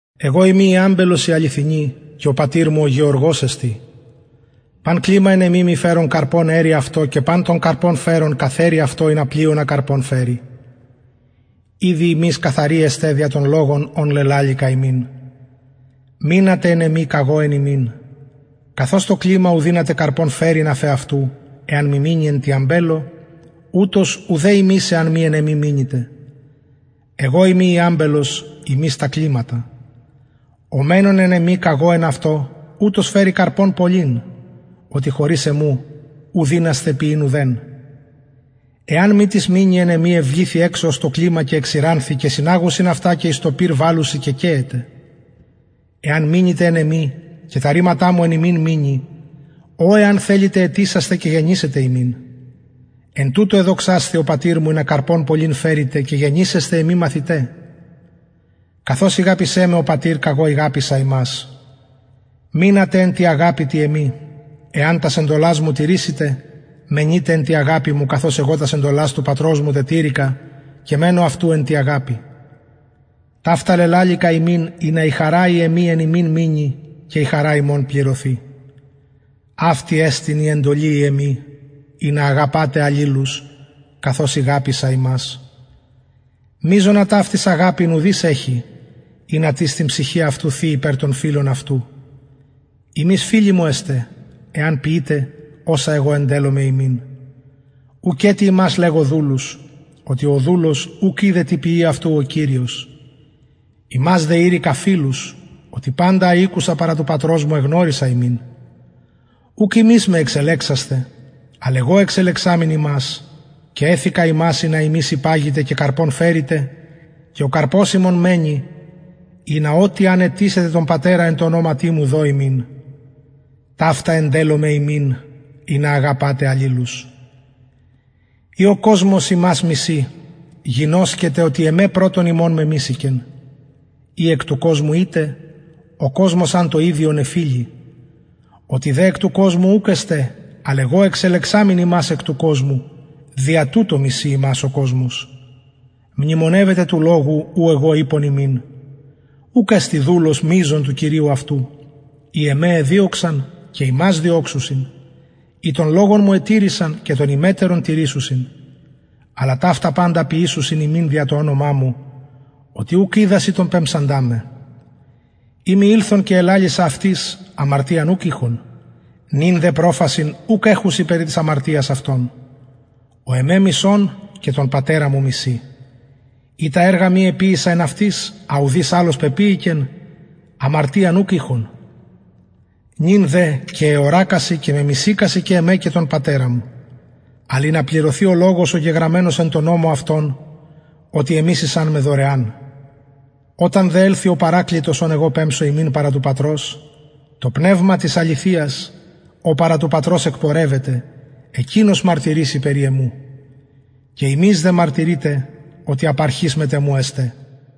εγω ειμι η αμπελος η αληθινη και ο πατηρ μου ο γεωργος εστιν παν κλημα εν εμοι μη φερον καρπον αιρει αυτο και παν το καρπον φερον καθαιρει αυτο ινα πλειονα καρπον φερη ηδη υμεις καθαροι εστε δια τον λογον ον λελαληκα υμιν μεινατε εν εμοι καγω εν υμιν καθως το κλημα ου δυναται καρπον φερειν αφ εαυτου εαν μη μεινη εν τη αμπελω ουτως ουδε υμεις εαν μη εν εμοι μεινητε εγω ειμι η αμπελος υμεις τα κληματα ο μενων εν εμοι καγω εν αυτω ουτος φερει καρπον πολυν οτι χωρις εμου ου δυνασθε ποιειν ουδεν εαν μη τις μεινη εν εμοι εβληθη εξω ως το κλημα και εξηρανθη και συναγουσιν αυτα και εις το πυρ βαλλουσιν και καιεται εαν μεινητε εν εμοι και τα ρηματα μου εν υμιν μεινη ο εαν θελητε αιτησεσθε και γενησεται υμιν εν τουτω εδοξασθη ο πατηρ μου ινα καρπον πολυν φερητε και γενησεσθε εμοι μαθηται καθως ηγαπησεν με ο πατηρ καγω ηγαπησα υμας μεινατε εν τη αγαπη τη εμη εαν τας εντολας μου τηρησητε μενειτε εν τη αγαπη μου καθως εγω τας εντολας του πατρος μου τετηρηκα και μενω αυτου εν τη αγαπη ταυτα λελαληκα υμιν ινα η χαρα η εμη εν υμιν μεινη και η χαρα υμων πληρωθη αυτη εστιν η εντολη η εμη ινα αγαπατε αλληλους καθως ηγαπησα υμας μειζονα ταυτης αγαπην ουδεις εχει ινα τις την ψυχην αυτου θη υπερ των φιλων αυτου υμεις φιλοι μου εστε εαν ποιητε οσα εγω εντελλομαι υμιν ουκετι υμας λεγω δουλους οτι ο δουλος ουκ οιδεν τι ποιει αυτου ο κυριος υμας δε ειρηκα φιλους οτι παντα α ηκουσα παρα του πατρος μου εγνωρισα υμιν ουχ υμεις με εξελεξασθε αλλ εγω εξελεξαμην υμας και εθηκα υμας ινα υμεις υπαγητε και καρπον φερητε και ο καρπος υμων μενη ινα ο τι αν αιτησητε τον πατερα εν τω ονοματι μου δω υμιν ταυτα εντελλομαι υμιν ινα αγαπατε αλληλους ει ο κοσμος υμας μισει γινωσκετε οτι εμε πρωτον υμων μεμισηκεν ει εκ του κοσμου ητε ο κοσμος αν το ιδιον εφιλει οτι δε εκ του κοσμου ουκ εστε αλλ εγω εξελεξαμην υμας εκ του κοσμου δια τουτο μισει υμας ο κοσμος μνημονευετε του λογου ου εγω ειπον υμιν ουκ εστιν δουλος μειζων του κυριου αυτου ει εμε εδιωξαν και υμας διωξουσιν ει τον λογον μου ετηρησαν και τον υμετερον τηρησουσιν αλλα ταυτα παντα ποιησουσιν υμιν δια το ονομα μου οτι ουκ οιδασιν τον πεμψαντα με ει μη ηλθον και ελαλησα αυτοις αμαρτιαν ουκ ειχον νυν δε προφασιν ουκ εχουσιν περι της αμαρτιας αυτων ο εμε μισων και τον πατερα μου μισει ει τα εργα μη εποιησα εν αυτοις α ουδεις αλλος πεποιηκεν αμαρτιαν ουκ ειχον νυν δε και εωρακασιν και μεμισηκασιν και εμε και τον πατερα μου αλλ ινα πληρωθη ο λογος ο γεγραμμενος εν τω νομω αυτων οτι εμισησαν με δωρεαν οταν δε ελθη ο παρακλητος ον εγω πεμψω υμιν παρα του πατρος το πνευμα της αληθειας ο παρα του πατρος εκπορευεται εκεινος μαρτυρησει περι εμου και υμεις δε μαρτυρειτε οτι απ αρχης μετ εμου εστε